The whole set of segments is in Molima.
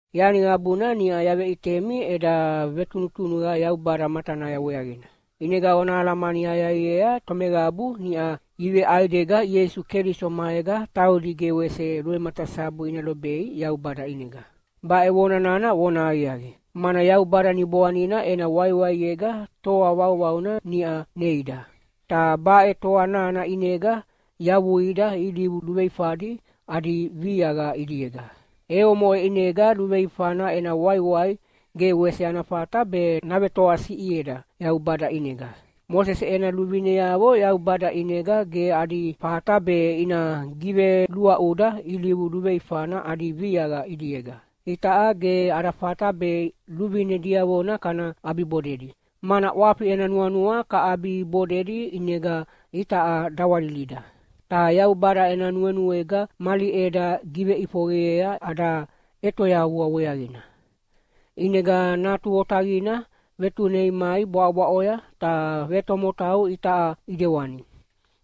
Yani qabuna niʼa yaveʼitemi eda vetunutunuqa Yaubada matanaya weaqina, ʼinega ona alamani aqiaqiea tomeqabu niʼa iveʼaidega Ieisu Keliso maega taudi ge wese luvematasabu ina lobei Yaubada ʼinega. Baʼe vona nana vonahaqiaqi, mana Yaubada Niboanina ena waiwaiega toa vauvauna niʼa neida. Ta baʼe toa nana ʼinega yavuida ilivu luveifadi adi viaqa ʼidiega, e omoʼe ʼinega luveifana ena waiwai ge wese ana fata be navetoasiʼieda Yaubada ʼinega. Mosese ena luvineavo Yaubada ʼinega ge adi fata be ina giveluaʼuda ilivu luveifana adi viaqa ʼidiega. Itaʼa ge ada fata be luvine diavona kana ʼabibodedi, mana ʼwafi ena nuanua kaʼabibodedi ʼinega itaʼa dawalilida. Ta Yaubada ena nuenuega mali ʼeda giveʼifoqeyea ada ʼetoyavua weaqina. ʼInega Natu Otaqina vetunei mai bwaʼobwaʼoya ta vetomotau itaʼa ʼidewani.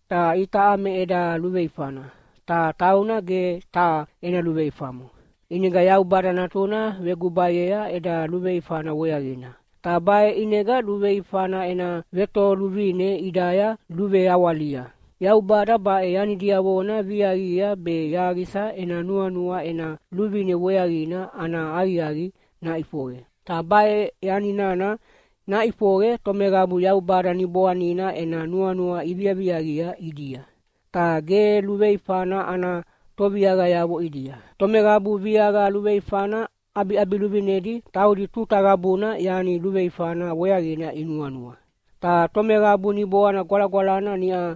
Ta itaʼa me eda luveifana, ta tauna ge taha ena luveifamo. ʼInega Yaubada Natuna vegubayea eda luveifana weaqina, ta baʼe ʼinega luveifana ena vetoluvine ʼidaya luveawalia. Yaubada baʼe yani diavona viaqia be yaqisa ena nuanua ena luvine weaqina ana aqiaqi naʼifoqe. Ta baʼe yani nana naʼifoqe tomeqabu Yaubada Niboanina ena nuanua iviaviaqia ʼidia, ta ge luveifana ana toviaqayavo ʼidia. Tomeqabu viaqa luveifana ʼabiʼabiluvinedi taudi tuta qabuna yani luveifana weaqina inuanua, ta tomeqabu Niboana Gwalagwalana niʼa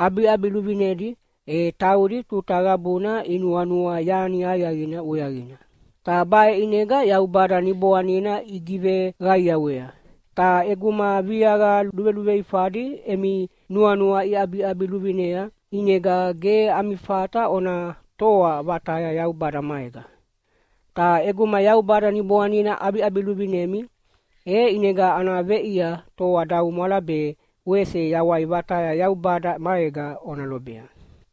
ʼabiʼabiluvinedi, e taudi tuta qabuna inuanua yani aqiaqina weaqina, ta baʼe ʼinega Yaubada Niboanina igiveqaiawea. Ta ʼeguma viaqa luveluveifadi emi nuanua iʼabiʼabiluvinea, ʼinega ge ami fata ona toa vataya Yaubada maega. Ta ʼeguma Yaubada Niboanina ʼabiʼabiluvinemi, e ʼinega ana veʼia toadaumwala be wese yawai vataya Yaubada maega ona lobea.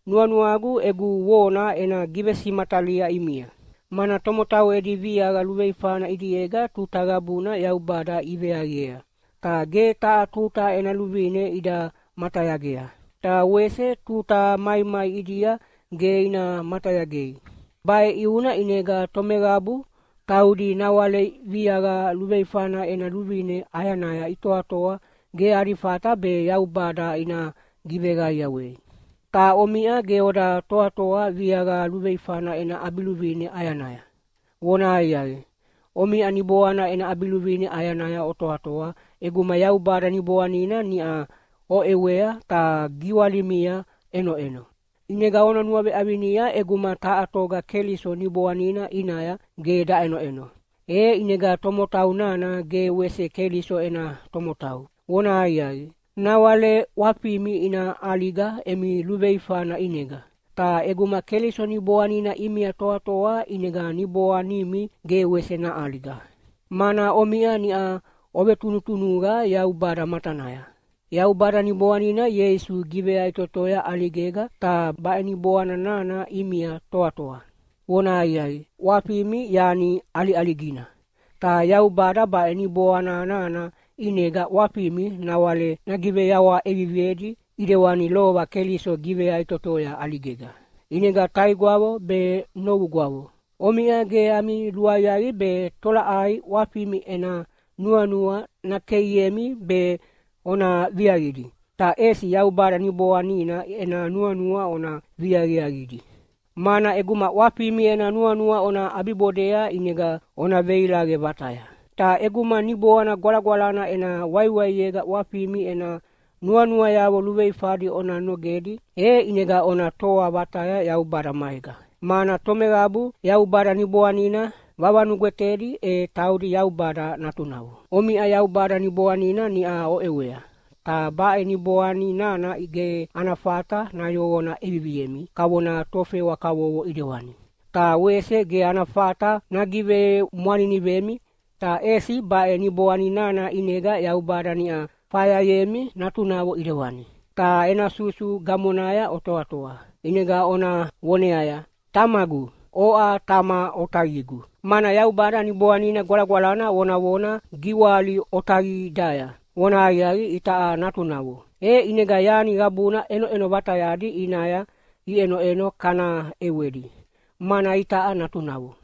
Nuanuagu egu vona ena givesimatalia ʼimia, mana tomotau edi viaqa luveifana ʼidiega tuta qabuna Yaubada iveaviea, ta ge taha tuta ena luvine ida matayagea, ta wese tuta maimai ʼidia ge ina matayagei. Baʼe ʼiuna ʼinega tomeqabu taudi nawale viaqa luveifana ena luvine ʼayanaya itoatoa ge adi fata be Yaubada ina giveqaiawei. Ta omiʼa ge oda toatoa viaqa luveifana ena ʼabiluvine ʼayanaya. Vonahaqiaqi, omiʼa Niboana ena ʼabiluvine ʼayanaya otoatoa ʼeguma Yaubada Niboanina niʼa oʼewea ta giwalimia ʼenoʼeno. ʼInega ona nuaveʼavinia ʼeguma taha toga Keliso Niboanina ʼinaya ge daʼenoʼeno, e ʼinega tomotau nana ge wese Keliso ena tomotau. Vonahaqiaqi, nawale ʼwafimi ina ʼaliga emi luveifana ʼinega. Ta ʼeguma Keliso Niboanina ʼimia toatoa ʼinega niboanimi ge wese naʼaliga, mana omiʼa niʼa ovetunutunuqa Yaubada matanaya. Yaubada Niboanina Ieisu giveyaʼitotoya ʼaligega, ta baʼe Niboana nana ʼimia toatoa. Vonahaqiaqi, ʼwafimi yani ʼaliʼaligina, ta Yaubada baʼe Niboana nana ʼinega ʼwafimi nawale nagiveyawaha ʼeviviedi ʼidewani lova Keliso giveyaʼitotoya ʼaligega. ʼInega taigwavo be novugwavo, omiʼa ge ami luaqiaqi be tolaʼai ʼwafimi ena nuanua nakeiemi be ona viaqidi, ta ʼesi Yaubada Niboanina ena nuanua ona viaviaqidi. Mana ʼeguma ʼwafimi ena nuanua ona ʼabibodea ʼinega ona veilaqe vataya. Ta ʼeguma Niboana Gwalagwalana ena waiwaiega ʼwafimi ena nuanuayavo luveifadi ona nogedi, e ʼinega ona toa vataya Yaubada maega, mana tomeqabu Yaubada Niboanina vavanugwetedi e taudi Yaubada natunavo. Omiʼa Yaubada Niboanina niʼa oʼewea, ta baʼe Niboani nana ge ana fata nayoqona ʼeviviemi kavona tofewa kavovo ʼidewani, ta wese ge ana fata nagivemwaninivemi. Ta ʼesi baʼe Niboani nana ʼinega Yaubada niʼa fayayemi natunavo ʼidewani, ta ena susu gamonaya otoatoa, ʼinega ona voneaya, “Tamagu, oʼa Tama otaqigu!” Mana Yaubada Niboanina Gwalagwalana vonavona giwali otaqidaya vonahaqiaqi itaʼa natunavo. E ʼinega yani qabuna ʼenoʼeno vatayadi ʼinaya iʼenoʼeno kana ʼewedi, mana itaʼa natunavo.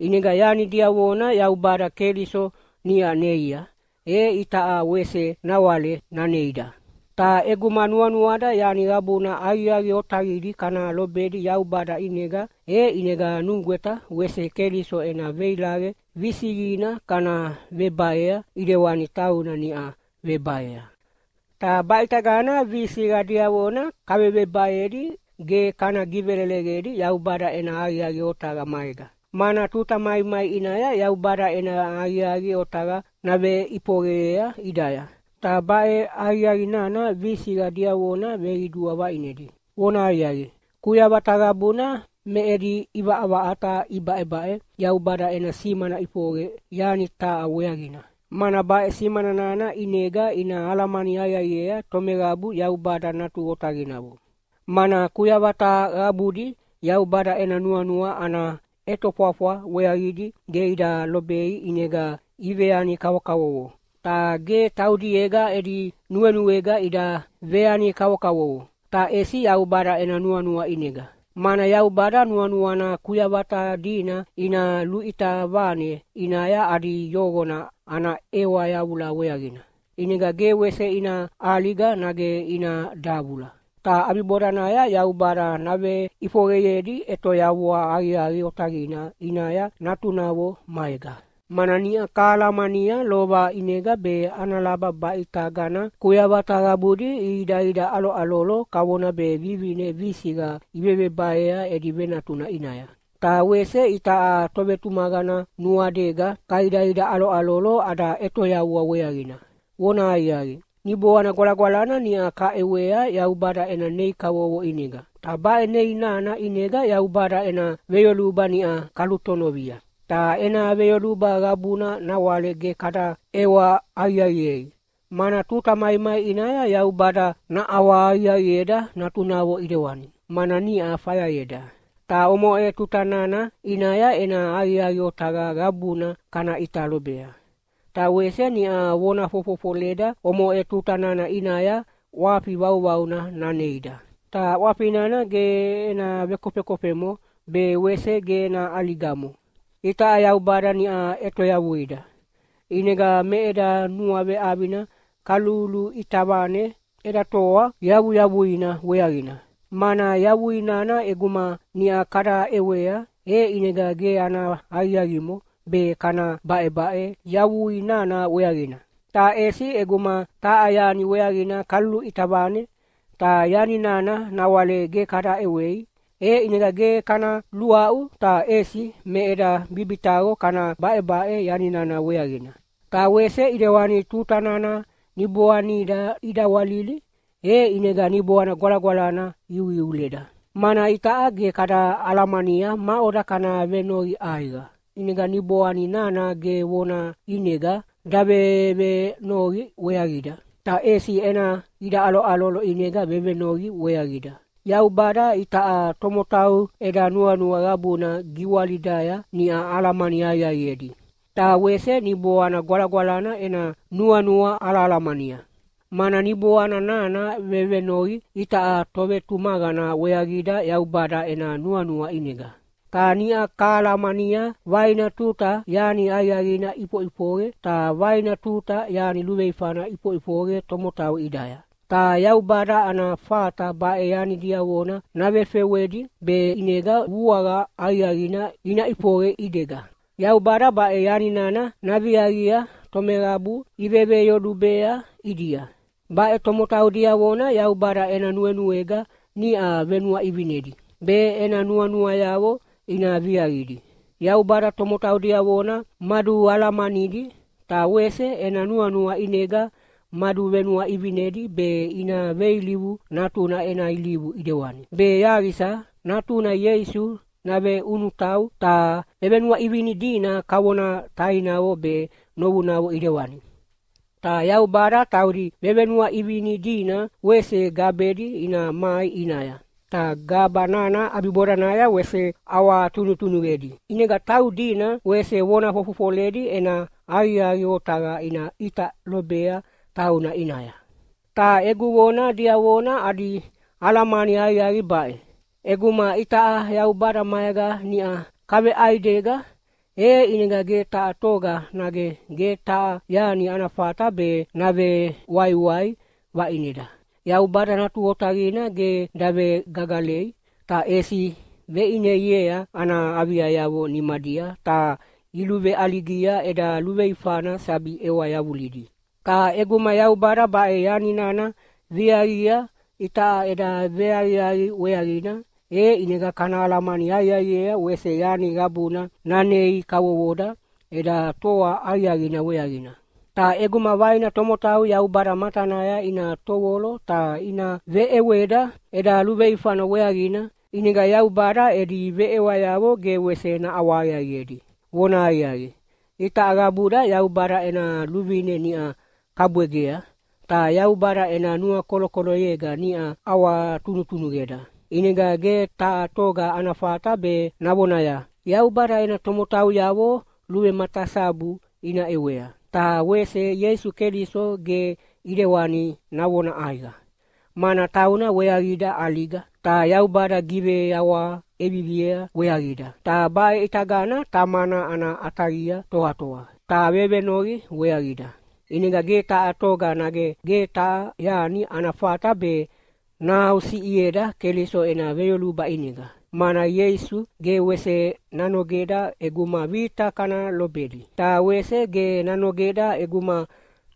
ʼInega yani diavona Yaubada Keliso niʼa neia, e itaʼa wese nawale naneida. Ta ʼeguma nuanuada yani qabuna aqiaqi otaqidi kana lobedi Yaubada ʼinega, e ʼinega nugweta wese Keliso ena veilaqe visiqina kana vebaea ʼidewani tauna niʼa vebaea. Ta baʼitagana visiqa diavona kavevebaedi ge kana giveleleqedi Yaubada ena aqiaqi otaqa maega, mana tuta maimai ʼinaya Yaubada ena aqiaqi otaqa naveʼifoqeyea ʼidaya, ta baʼe aqiaqi nana visiqa diavona veqidua vaʼinedi. Vonahaqiaqi, kuyavata qabuna me edi ʼivaʼavaʼata ibaʼebaʼe Yaubada ena simana ʼifoqe yani taha weaqina, mana baʼe simana nana ʼinega ina alamani aqiaqiea tomeqabu Yaubada natu otaqinavo. Mana kuyavata qabudi Yaubada ena nuanua ana ʼetofwafwa weaqidi ge ida lobei ʼinega iveyani kavokavovo. Ta ge taudiega edi nuenuega ida veyani kavokavovo, ta ʼesi Yaubada ena nuanua ʼinega, mana Yaubada nuanuana kuyavata dina ina luʼita vane ʼinaya adi yoqona ana ʼewa yavula weaqina, ʼinega ge wese ina ʼaliga nage ina davula. Ta ʼabibodanaya Yaubada naveʼifoqeyedi ʼetoyavua aqiaqi otaqina ʼinaya natunavo maega. Mana niʼa kahalamania lova ʼinega be ana laba baʼe ʼitagana kuyavata qabudi ihidaidaʼaloʼalolo kavona be vivine visiqa ivevebaea edi venatuna ʼinaya. Ta wese itaʼa tovetumaqana nuadega kaidaidaʼaloʼalolo ada ʼetoyavua weaqina. Vonahaqiaqi, Niboana Gwalagwalana niʼa kaʼewea Yaubada ena nei kavovo ʼinega, ta baʼe nei nana ʼinega Yaubada ena veyoluba niʼa kalutonovia, ta ena veyoluba qabuna nawale ge kada ʼewa aqiaqiei, mana tuta maimai ʼinaya Yaubada naʼawahaqiaqieda natunavo ʼidewani, mana niʼa fayayeda. Ta omoʼe tuta nana ʼinaya ena aqiaqi otaqa qabuna kana ʼita lobea. Ta wese niʼa vona fofofoleda omoʼe tuta nana ʼinaya ʼwafi vauvauna naneida, ta ʼwafi nana ge ena vekofekofemo be wese ge ena ʼaligamo. Itaʼa Yaubada niʼa ʼetoyavuida, ʼinega me eda nuaveʼavina kaluluʼita vane eda toa yavuyavuina weaqina. Mana yavui nana ʼeguma niʼa kada ʼewea, e ʼinega ge ana aqiaqimo be kana baʼebaʼe yavui nana weaqina. Ta ʼesi ʼeguma taha yani weaqina kaluluʼita vane, ta yani nana nawale ge kada ʼewei, e ʼinega ge kana luaʼu ta ʼesi me eda bibitaqo kana baʼebaʼe yani nana weaqina. Ta wese ʼidewani tuta nana niboanida idawalili, e ʼinega Niboana Gwalagwalana iuiuleda, mana itaʼa ge kada alamania maʼoda kana venoqi ʼaiqa. ʼInega Niboani nana ge vona ʼinega davevenoqi weaqida, ta ʼesi ena idaʼaloʼalolo ʼinega vevenoqi weaqida. Yaubada itaʼa tomotau eda nuanua qabuna giwalidaya niʼa alamani aqiaqiedi, ta wese Niboana Gwalagwalana ena nuanua alahalamania, mana Niboana nana vevenoqi itaʼa tovetumaqana weaqida Yaubada ena nuanua ʼinega. Ta niʼa kahalamania vaina tuta yani aqiaqina iʼifoʼifoqe ta vaina tuta yani luveifana iʼifoʼifoqe tomotau ʼidaya, ta Yaubada ana fata baʼe yani diavona navefewedi be ʼinega vuaqa aqiaqina ina ʼifoqe ʼidiega. Yaubada baʼe yani nana naviaqia tomeqabu iveveyolubea ʼidia. Baʼe tomotau diavona Yaubada ena nuenuega niʼa venuaʼivinedi, be ena nuanuayavo ina viaqidi. Yaubada tomotau diavona madualamanidi, ta wese ena nuanua ʼinega maduvenuaʼivinedi be ina veilivu Natuna ena ilivu ʼidewani, be yaqisa Natuna Ieisu naveʼunutau ta vevenuaʼivini dina kavona tainavo be novunavo ʼidewani. Ta Yaubada taudi vevenuaʼivini dina wese gabedi ina mai ʼinaya. Ta gaba nana ʼabibodanaya wese ʼawatunutunuqedi, ʼinega taudina wese vona fofofoledi ena aqiaqi otaqa ina ʼita lobea tauna ʼinaya. Ta egu vona diavona adi alamani aqiaqi baʼe: ʼEguma itaʼa Yaubada maega niʼa kaveʼaidega, e ʼinega ge taha toga nage ge taha yani ana fata be navewaiwai vaʼineda. Yaubada Natu Otaqina ge davegagalei, ta ʼesi veʼineiea ana aviayavo nimadia ta iluveʼaligia eda luveifana sabi ʼewa yavulidi. Ta ʼeguma Yaubada baʼe yani nana viaqia itaʼa eda veaqiaqi weaqina, e ʼinega kana alamani aqiaqiea wese yani qabuna nanei kavovoda eda toa aqiaqina weaqina. Ta ʼeguma vaina tomotau Yaubada matanaya ina tovolo ta ina veʼeweda eda luveifana weaqina, ʼinega Yaubada edi veʼewayavo ge wese naʼawahaqiaqiedi. Vonahaqiaqi, itaʼa qabuda Yaubada ena luvine niʼa kabwegea, ta Yaubada ena nuakolokoloyega niʼa ʼawatunutunuqeda. ʼInega ge taha toga ana fata be navonaya, “Yaubada ena tomotauyavo luvematasabu ina ʼewea.” Ta wese Ieisu Keliso ge ʼidewani navona ʼaiqa, mana tauna weaqida ʼaliga, ta Yaubada giveyawaha ʼeviviea weaqida, ta baʼe ʼitagana Tamana ana ʼataqia toatoa, ta vevenoqi weaqida. ʼInega ge taha toga nage ge taha yani ana fata be nahaʼusiʼieda Keliso ena veyoluba ʼinega, mana Ieisu ge wese nanogeda ʼeguma vita kana lobedi. Ta wese ge nanogeda ʼeguma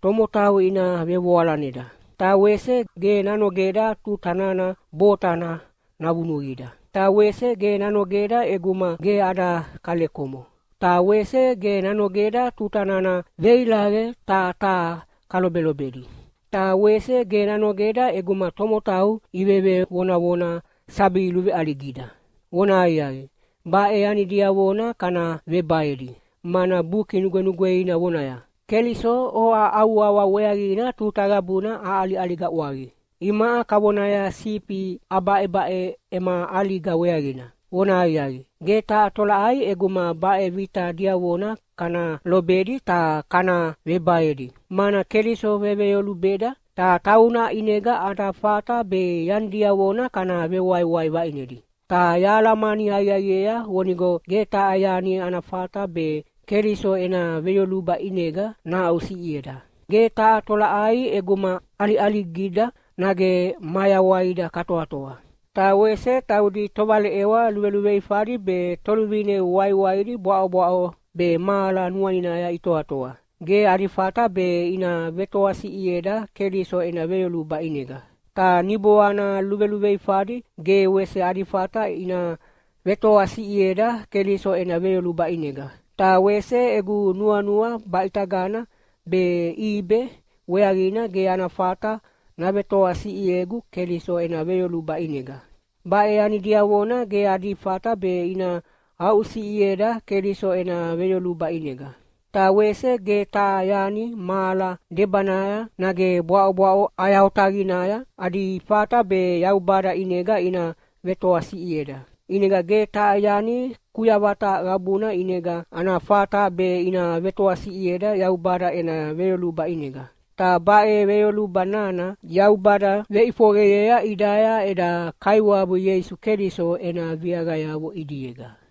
tomotau ina vevoalaneda. Ta wese ge nanogeda tuta nana botana navunuqida. Ta wese ge nanogeda ʼeguma ge ada kalekomo. Ta wese ge nanogeda tuta nana veilaqe taha taha kalobelobedi. Ta wese ge nanogeda ʼeguma tomotau ivevevonavona sabi luveʼaligida. Vonahaqiaqi, baʼe yani diavona kana vebaedi, mana Buki Nugwenugweina vonaya, “Keliso, oʼa au wawa weaqina tuta qabuna aʼaliʼaliga ʼwaqi. Imaʼa kavonaya sifi abaʼebaʼe ema ʼaliga weaqina.” Vonahaqiaqi, ge taha tolaʼai ʼeguma baʼe vita diavona kana lobedi ta kana vebaedi, mana Keliso veveyolubeda, ta tauna ʼinega ada fata be yani diavona kana vewaiwai vaʼinedi. Ta yahalamani aqiaqiea vonigo ge taha yani ana fata be Keliso ena veyoluba ʼinega nahaʼusiʼieda. Ge taha tolaʼai ʼeguma ʼaliʼaligida nage mayawaida katoatoa. Ta wese taudi tovaleʼewa luveluveifadi be toluvine waiwaidi bwaʼobwaʼo be mahala nuaninaya itoatoa, ge adi fata be ina vetoasiʼieda Keliso ena veyoluba ʼinega. Ta niboana luveluveifadi ge wese adi fata ina vetoasiʼieda Keliso ena veyoluba ʼinega. Ta wese egu nuanua baʼitagana be ʼibe weaqina ge ana fata navetoasiʼiegu Keliso ena veyoluba ʼinega. Baʼe yani diavona ge adi fata be ina aʼusiʼieda Keliso ena veyoluba ʼinega. Ta wese ge taha yani mahala debanaya nage bwaʼobwaʼo ʼaya otaqinaya adi fata be Yaubada ʼinega ina vetoasiʼieda. ʼInega ge taha yani kuyavata qabuna ʼinega ana fata be ina vetoasiʼieda Yaubada ena veyoluba ʼinega. Ta baʼe veyoluba nana Yaubada veʼifoqeyea ʼidaya eda Kaiwabu Ieisu Keliso ena viaqayavo ʼidiega.